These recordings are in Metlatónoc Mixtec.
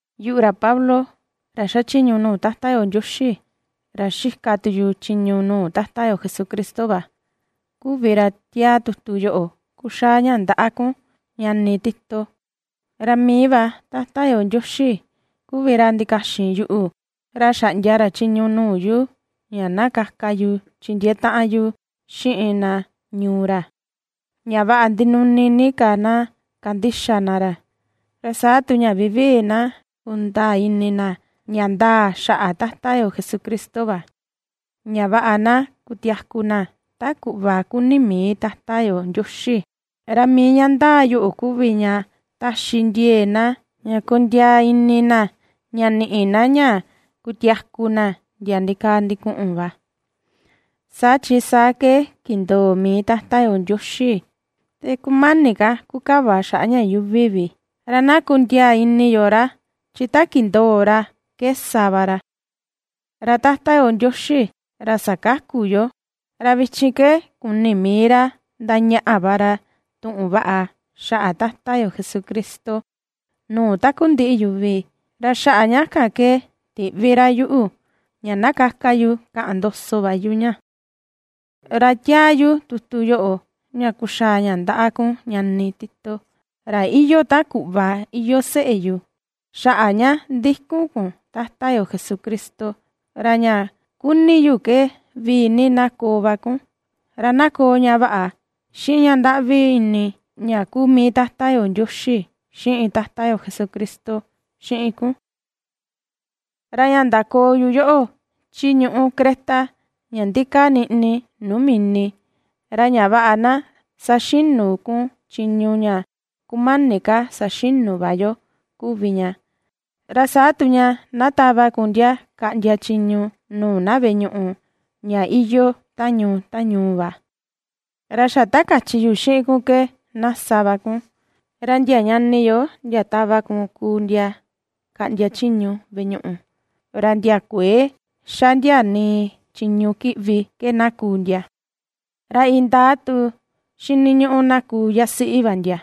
Yuꞌu, ra Pablo, ra xachiñu nuu Tata yo Ndioxi, ra xika tu yu chiñu nuu Tata yo Jesucristo va, kuvi ra ^tiaa tutu yoꞌo kuxaa ña ndaꞌa kun, ñani Tito. Ra mii va Tata yo Ndioxi kuvi ra ndikaxin yuꞌu, ra xaꞌndia ra chiñu nuu yu ña na kaka yu chindiee taꞌan yu xiꞌin na ñuu ra, ña vaꞌa ndinuni ni ka na kandixa na ra, ra saa tu ña vivii na kundaa ini na ña ndaa xaꞌa Tata yo Jesucristo va, ña vaꞌa na kutiaku na ta kuꞌva kuni mii Tata yo Ndioxi. Ra mii ña ndaa yoꞌo kuvi ña taxi ndiee na ña kondiaa ini na ña niꞌi na ña kutiaku na ndia ndikaa ndikuꞌun va, saa chi saa ke kindoo mii Tata yo Ndioxi te kumani ka kukava xaꞌa ña yuuvi vi. Ra na kundiaa ini yo ra, chi ta kindoo ra ke sa va ra. Ra Tata yo Ndioxi, ra sakaku yoo, ra vichin ke kuni mii ra ^ndañaꞌa va ra tuꞌun vaꞌa xaꞌa Tata yo Jesucristo nuu takundiꞌi yuvi, ra xaꞌa ña kan ke tiꞌvi ra yuꞌu, ña na kaka yu kaꞌan ndoso va yu ña. Ra ^tiaa yu tutu yoꞌo ña kuxaa ña ndaꞌa kun ñani Tito, ra iyoo ta kuꞌva iyoo seꞌe yu xaꞌa ña ndikun kun Tata yo Jesucristo, ra ña ^kuni yu ke vii ni na koo va kun, ra na koo ña vaꞌa, xiꞌin ña ndaꞌvi ini ña kuu mii Tata yo Ndioxi xiꞌin Tata yo Jesucristo xiꞌin kun. Ra ña ndakoo yu yoꞌo, chi ñuꞌu Creta, ña ndikaa niꞌni nuu mini, ra ña vaꞌa na saxinu kun chiñu ña kumani ka saxinu va yo kuvi ña, ra saa tu ña na tava kun ndia kaꞌndia chiñu nuu na veꞌe ñuꞌu, ña iyoo ta ñuu, ta ñuu va, ra xa ta kachi yu xiꞌin kun ke na sa va kun. Ra ndia ñani yo ndia tava kun kuu ndia kaꞌndia chiñu veꞌe ñuꞌu, ra ndia kuëe ^xa ndia nii chiñu kiꞌvi ke na kuu ndia. Ra indaa tu xiniñuꞌu na kuu yasiꞌi va ndia,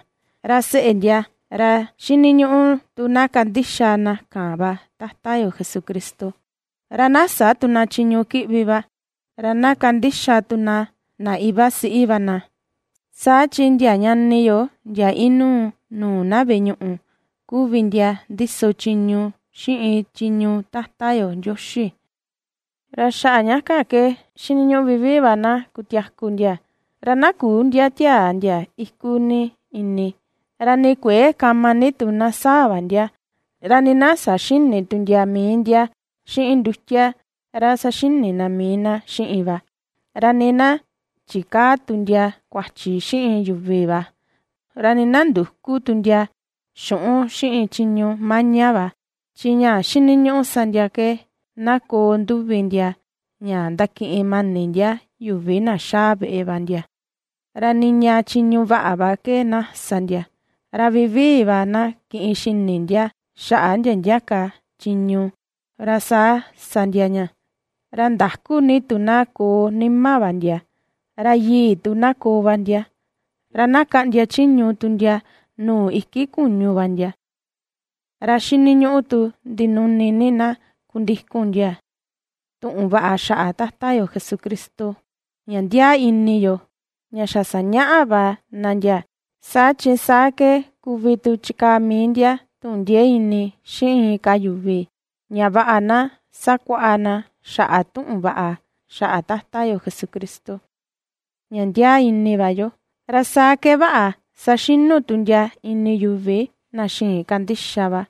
ra seꞌe ndia, ra xiniñuꞌu tu na kandixa na kan va Tata yo Jesucristo, ra na sä tu na chiñu kiꞌvi va, ra na kandixa tu na na iva siꞌi va na. Saa chi ndia ñani yo ndia inuu nuu na veꞌe ñuꞌu, kuvi ndia ndiso chiñu xiꞌin chiñu Tata yo Ndioxi, ra xaꞌa ña kan ke xiniñuꞌu vivii va na kutiaku ndia. Ra na küu ndia tiaa ndia iku ni ini, ra nii kuëe kama ni tu na saa va ndia, ra nii na saxïni tu ndia mii ndia xiꞌin ndutia ra saxini na mii na xiꞌin va, ra nii na chikäa tu ndia kuachi xiꞌin yuvi va, ra nii na ndüku tu ndia xuꞌun xiꞌin chiñu maña va. Chi ña xiniñuꞌu sa ndia ke na koo nduvi ndia ña ndakiꞌin mani ndia yuvi na xaa veꞌe va ndia, ra niña chiñu vaꞌa va ke na sa ndia, ra vivii va na kiꞌin xini ndia xaꞌa ndia ndia ka chiñu, ra saa sa ndia ña, ra ndakú ni tu na koo nima va ndia, ra yii tu na koo va ndia, ra na kaꞌndia chiñu tu ndia nuu iki kuñu va ndia. Ra xiniñuꞌu tu ndinuni ni na kundikun ndia tuꞌun vaꞌa xaꞌa Tata yo Jesucristo, ña ndiaa ini yo, ña xa sañaꞌa va na ndia, saa chi saa ke kuvi tu chikaa mii ndia, tuꞌun ndiee ini xiꞌin inka yuvi, ña vaꞌa na sakuaꞌa na xaꞌa tuꞌun vaꞌa xaꞌa Tata yo Jesucristo, ña ndiaa ini va yo, ra saa ke vaꞌa saxinu tu ndia ini yuvi na xïin kandixa va.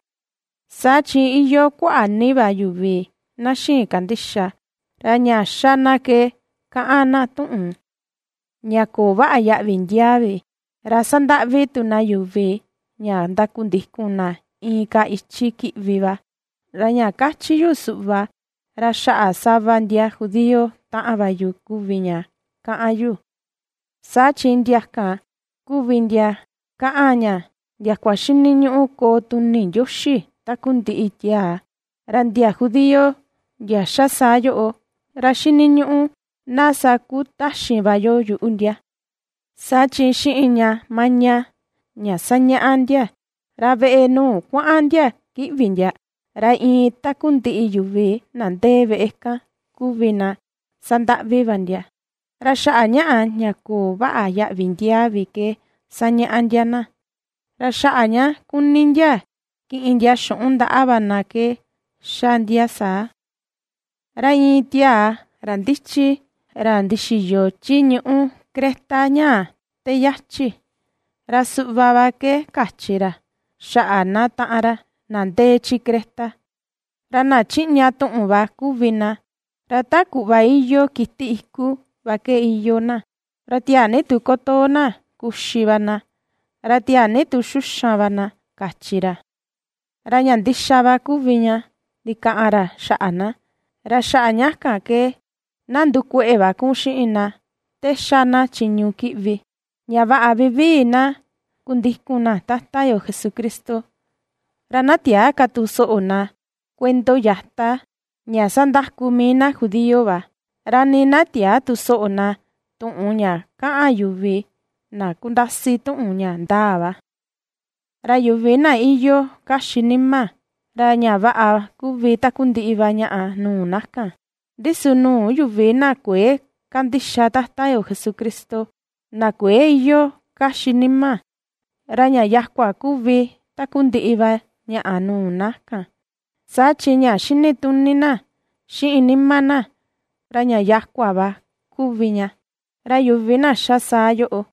Saa chi iyoo kuaꞌa ni va yuvi na xïin kandixa, ra ña xa na ke kaꞌan na tuꞌun ña köo vaꞌa yaꞌvi ndiaa vi, ra sandaꞌvi tu na yuvi ña ndakundikun na inka ichi kiꞌvi va. Ra ña kachi yu suꞌva, ra xaꞌa sava ndia judío taꞌan va yu kuvi ña kaꞌan yu, saa chi ndia kan kuvi ndia kaꞌan ña ndiakua xiniñuꞌu koo tuni Ndioxi takundiꞌi tiaa. Ra ndia judío ndia ^xa saa yoꞌo, ra xiniñuꞌu na sakutaxin va yo yuꞌu ndia, saa chi xiꞌin ña maña, ña ^sañaꞌa ndia, ra veꞌe nuu kuaꞌan ndia kiꞌvi ndia, ra iin takundiꞌi yuvi na ndee veꞌe kan kuvi na sandaꞌvi va ndia, ra xaꞌa ñaꞌa ña köo vaꞌa yaꞌvi ndiaa vi ke ^sañaꞌa ndia na, ra xaꞌa ña ^kuni ndia kiꞌin ndia xuꞌun ndaꞌa va na ke ^xa ndia saa. Ra iin tiaa, ra ndichi, ra ndixiyo chi ñuꞌu Creta ñaa te yachi, ra suꞌva va ke kachi ra xaꞌa na taꞌan ra: “Na ndee chi Creta, ra na chiꞌña tuꞌun va kuvi na, ra ta kuꞌva iyoo kiti iku va ke iyoo na, ra tiaa ni tu kutoo na kuxi va na, ra tiaa ni tu xuxan va na”, kachi ra. Ra ña ndixa va kuvi ña ndikaꞌan ra xaꞌa na, ra xaꞌa ña kan ke na ndukueꞌe va kun xiꞌin na te ^xa na chiñu kiꞌvi, ña vaꞌa vivii na kundikun na Tata yo Jesucristo. Ra na tiäa ka tu soꞌo na kuendo yata ña sandaku mii na judío va, ra nii na tiäa tu soꞌo na tuꞌun ña kaꞌan yuvi na kundasi tuꞌun ña ndaa va. Ra yuvi na iyoo kaxi nima, ra ña vaꞌa kuvi takundiꞌi va ñaꞌa nuu na kan; ndi su nuu yuvi na kuëe kandixa Tata yo Jesucristo, na kuëe iyoo kaxi nima, ra ña yakua kuvi takundiꞌi va ñaꞌa nuu na kan; saa chi ña xinituni na, xiꞌin nima na, ra ña yakua va kuvi ña. Ra yuvi na ^xa saa yoꞌo,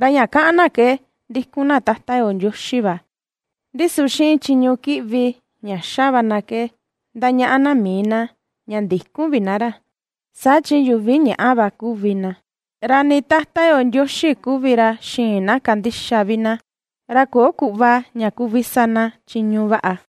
ra ña kaꞌan na ke ^ndikun na Tata yo Ndioxi va, ndi su xiꞌin chiñu kiꞌvi ña ^xa va na ke ndañaꞌa na mii na, ña ndïkun vi na ra. Saa chi yuvi ñaꞌa va kuvi na, ra nii Tata yo Ndioxi kuvi ra xïin na kandixa vi na, ra köo kuꞌva ña kuvi sa na chiñu vaꞌa.